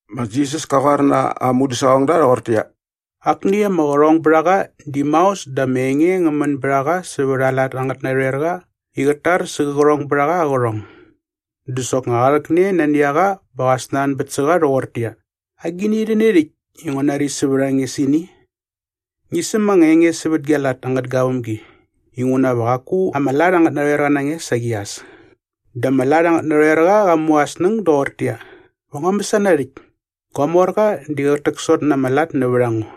Ma Jisas ka qoar na aa mudäsaqongda rhoqortäqyia, “Akni ama qärhongbärhaqa di maos dä ama enge ngä män bät a qa sävät aa lat angät narhoerqa i qät tar sä qä qärhongbärhaqa aa qärhong. Dä soknga qa rhäkne nani a qa bä qa snanbät sä qa rhoqortäqyia, ‘Agini rhäni rhäkt i ngua nari sävät a nge sä ini? Ngi säm anga enge sävät gia lat angät gavämgi inguna va qaku ama lat angät narhoerqa na nge saqi as.’” “Dä ama lat angät narhoerqa qa mu aa snäng doqortäqyia, ‘Va ngua mäsana rhäkt? Gua morqa di qät täksot na ama lat nävät a ngo.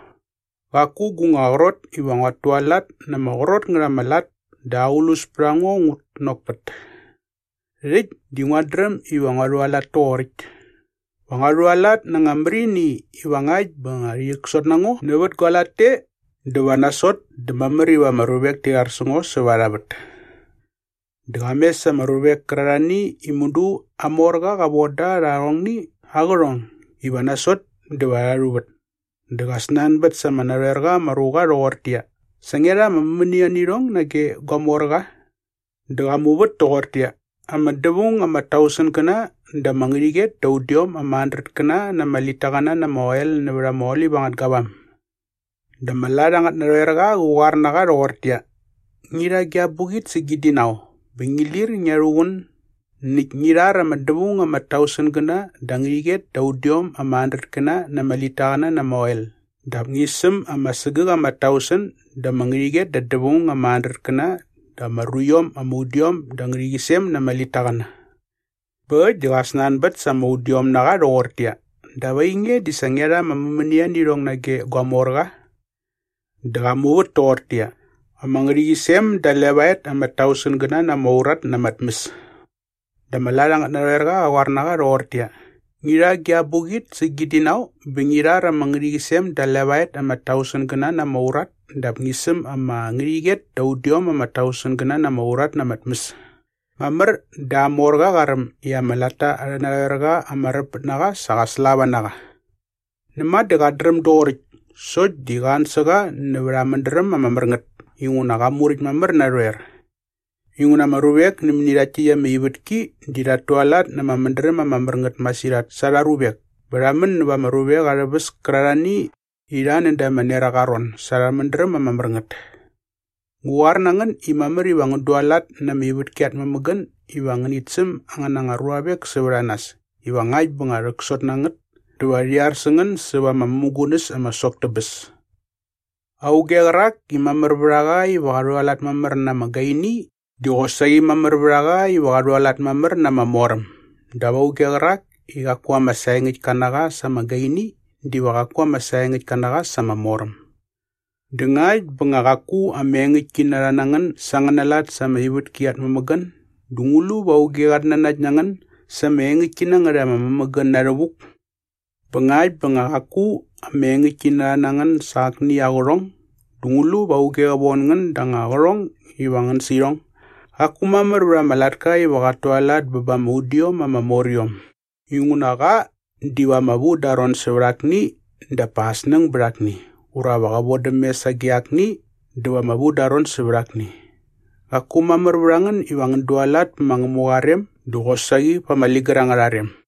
Qaku gu nga qrot iva nguat tualat na ama qrot ngät ama lat dä aqlus pät a ngo ngut nokpät. Rhäkt di nguat dräm iva ngua rhualat toqoräkt. Va ngua rhualat na anga märini iva ngakt bä nga rhi rhäksot na ngo nävät gua lat te dä va nasot dä mamär iva ama ruvek ti rhar sä ngo säva arha vät.’” “Dä qa mes ama ruvek kärarhani i mudu aa morqa qa von da rha arhongni aa qärhong iva nasot dä va rha rhuvät. Dä qa snanbät sa ama narhoerqa ama ruqa rhoqortäqyia, ‘Sa ngia rha ama mämänia nä irhong nage gua morqa?’” “Dä qa muvät toqortäqyia, ‘Ama dävaung ama tausengäna da ama ngärhäqyet da udiom ama handretkäna na ama litaqäna na ama oel nävät ama olip angät gavam.’” “Dä ama lat angät narhoerqa qä qoar na qa rhoqortäqyia, ‘Ngi rha gia abuqit sä gi dinau bä ngi lir ngia rhuqun näkt ngi rhar ama dävaung ama tausengäna da ama ngärhäqyet da udiom ama handretkäna na ama litaqäna na ama oel dap ngi säm ama sägäk ama tausen da ama ngärhäqyet da dävaung ama handretkäna da ama ruiom ama udiom da ama ngärhäqyisem na ama litaqäna.’” “Bä äkt dä qa snanbät sa ama udiom na qa rhoqortäqyia, ‘Dap ainge di sa ngia rha ama mämänia nä irhong nage gua morqa?’” “Dä qa muvät toqortäqyia, ‘Ama ngärhäqyisem da levaet ama tausengäna na ama urat na ama tmäs.’” “Dä ama lat angät narhoerqa qä qoar na qa rhoqortäqyia, ‘Ngi rha gia abuqit sä gi dinau bä ngi rhar ama ngärhäqyisem da levaet ama tausengäna na ama urat dap ngi säm ama ngärhäqyet da udiom ama tausengäna na ama urat na ama tmäs.’ “Mamär dä aa morqa qa räm i ama latta arhä narhoerqa ama räpmät na qa sa qa slava na qa. Näma dä qat dräm doqoräkt sokt di qa an sä qa nävät aa mädräm ama mär ngät inguna qa muräkt mamär narhoer. Inguna ama ruvek nämäni rhaktni ama ivätki di rhat tualat na ama mädräm ama mär ngät masirhat sa arha ruvek bä rha män näva ama ruvek arhä väs kärarhani i rha näda ama neraqa aa ron sa arhä mädräm ama mär ngät. “Ngu qoar na ngän i mamär iva ngän dualat na ama ivätki at mämägän iva ngänit säm angän anga ruavek sävät a nas iva ngakt bä nga rhäksot na ngät dä va rhi ar sä ngän säva ama mämugunäs ama sok tä bäs. Auge qärak i mamär vät a qa iva qa rhualat mamär na ama gaini di qosaqi mamär vät a qa iva qa rhualat mamär na ama moräm dap auge qärak i qaku ama saengäktka na qa sa ama gaini diva qaku ama saengäktka na qa sa ama moräm. Dä ngakt bä nga qaku ama engäktkinarha na ngän sa angäna lat sa ama ivätki at mämägän dä ngu lu va auge qat nanakt na ngän sa ama engäktki na ngät ama mämägän na rhävuk? Bä ngakt bä nga qaku ama engäktkinarha na ngän sa akni aa qärhong dä ngu lu va auge qä von ngän da anga qärhong iva ngän sä irhong?” “Qaku mamär vät ama latka iva qat tualat bä ba ama udiom ama moriom inguna qa diva ama vu dä aa ron sävät akni dap pa aa snäng bät akni ura va qä vodäm mes sage akni dä va ama vu dä aa ron sävät akni. Qaku mamär vät a ngän iva ngän dualat pä ma Ngämuqa aa rem dä qosaqi pa ama ligär angärha rem.”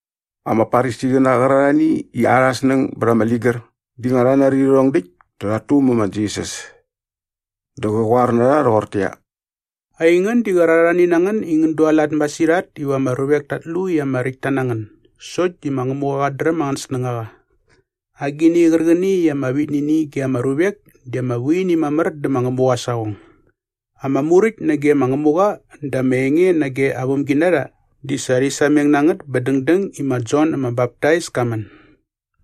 Ama Farisiqäna qärarhani i arhä snäng bät ama ligär di nga rha nari rhärhong däkt dä rhat tumä ma Jisas. Dä qä qoar na rha rhoqortäqyia, “Aingän di qärarhani na ngän i ngän dualat masirhat iva ama ruvek tat lu i ama räkt ta na ngän sokt di ma Ngämuqa qat dräm angän snängaqa. Agini qärqäni i ama vit nä ini ge ama ruvek di ama vu ini mamär dä ma Ngämuqa aa saqong.” “Ama Muräkt nage ma Ngämuqa dä ama enge nage aa vämginarha di sa rhi sameng na ngät bä dängdäng i ma Jon ama Baptais ka män.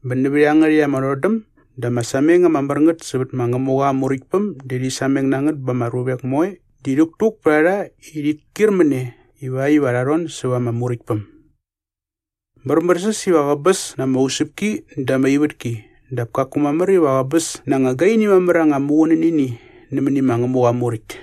Bä nävät iangärhäkt ama rhodäm dä ama sameng ama mär ngät sävät ma Ngämuqa aa Muräktpäm di rhi sameng na ngät bä ama ruvek moe di rhäktuk pät a rha i rhit kyir mä ne ivakt iva rha rhon säva ama Muräktpäm. Märmärsäs iva qäbäs na ama usäpki dä ama ivätki dap kaku mamär iva qäbäs na anga gaini mamär anga muqunänini nämäni ma Ngämuqa aa Muräkt.”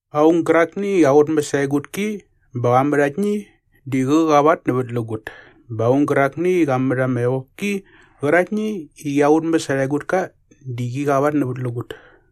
“Aung gärakni i qa qutmäs aa egutki bä qa mät aktni di qä qavatnävätlägut bä aung gärakni i qa mät ama evopki qäraktni i qia qutmäs arha egutka di qi qavatnävätlägut.”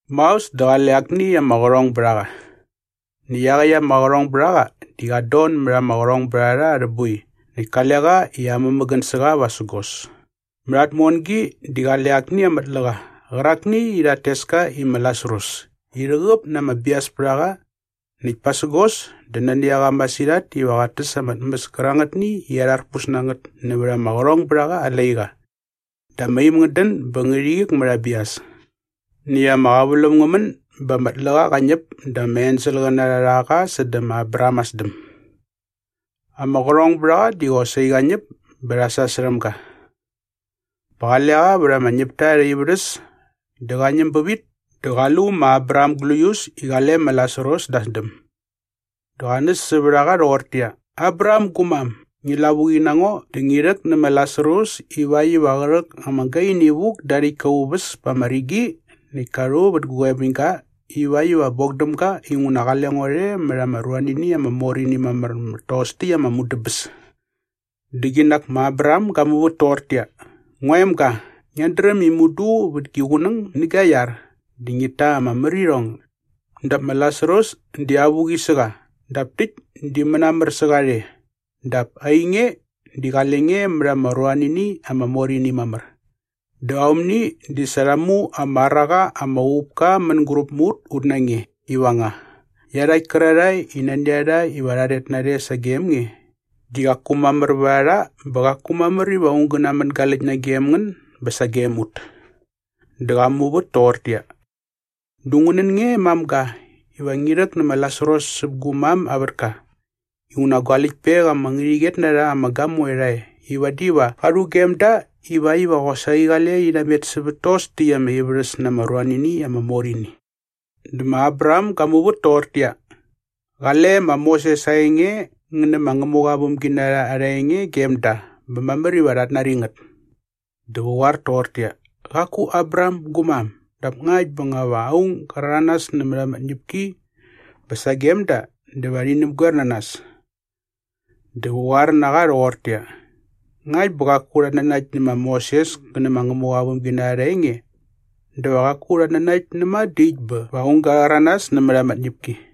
“Maos dä qale akni ama qärhongbärhaqa. Näkt iaqäkt ama qärhongbärhaqa di qat don mät ama qärhongbärharha arhä boi näkt kale qa i amämägän sä qa vasägos. Mät aa tmongi di qale akni ama tläqa qärakni i rhat tes ka i ma Lasarus i rhäqäp na ama bias pät a qa näkt pasägos dä nani a qa masirhat iva qat täs ama tmäs kärangätni i arharpus nä ngät nävät ama qärhongbärhaqa aa laiqa. Dä ama im ngät dän bä ngärhi qik mät aa bias.” “Näkt ama qäväläm ngä män bä ama tläqa qa ñäp dä ama enselqäna rha rha qa sädä ma Abraham aa sdäm. “Ama qärhongbärhaqa di qosaqi qa ñäp bä rha sasärhäm ga. Bä qale qa vät ama ñäpta arhä ivärhäs dä qa ñäm bävit dä qa lu ma Abraham gläius i qale ma Lasarus da aa sdäm. Dä qa näs sävät a qa rhoqortäqyia, ‘Abraham gu mam, ngi lavuqi na ngo dä ngi rhäk nä ma Lasarus ivakt iva qä rhäk ama gaini vuk da aa rhäktka aa uväs pa ama rigi näkt ka rhu vät gu qoebäñga ivakt iva bok däm ga inguna qale ngo rhe mät ama ruanini ama mor ini mamär mät tos ama mudäbäs.’” “Dä qinak ma Abraham ga muvät toqortäqyia, ‘Ngua emga, ngiat dräm i mudu vät gi qunäng nä gia iar dä ngit ta ama märirhong dap ma Lasarus di avuqi sä qa dap täkt di mänamär sä qa rhe dap ainge di qale nge mät ama ruanini ama mor ini mamär. Dä aomni di sa rha mu ama ar a qa ama uqupka mänguräp mä ut ut na nge iva nga iarhakt kärarhae i nani a rha iva rha rhet narhe sagem nge di qaku mamär vät a rha bä qaku mamär iva aung gä namängaläkt nagem ngän bä sagem ut.’” “Dä qa muvät toqortäqyia, ‘Dä ngu nän nge mamga iva ngi rhäk nä ma Lasarus säp gu mam aa vätka inguna gua läktpek ama ngärhäqyet na rha ama gamoe rha e i vadi va qa rhugem da ivakt iva qosaqi qale rhi namet sävät tos täkt ama ivärhäs na ama ruanini ama mor ini.’” “Dä ma Abraham ga muvät toqortäqyia, ‘Qale ma Moses aa enge ngä nä ma Ngämuqa aa vämginarha arha enge gem da bä mamär iva rhat nari ngät.’ “Dä qä qoar toqortäqyia, ‘Qaku Abraham gu mam, dap ngakt bä nga va aung ga rhäranas nämät ama tñäpki bä sagem da dä va rhi näpgoer na nas.’ “Dä qä qoar na qa rhoqortäqyia, ‘Ngakt bä qaku rhat nanakt nä ma Moses kä nä ma Ngämuqa aa vämginarha arha enge dä va qaku rhat nanakt näma dä äkt bä va aung ga rhäranas nämät ama tñäpki.’”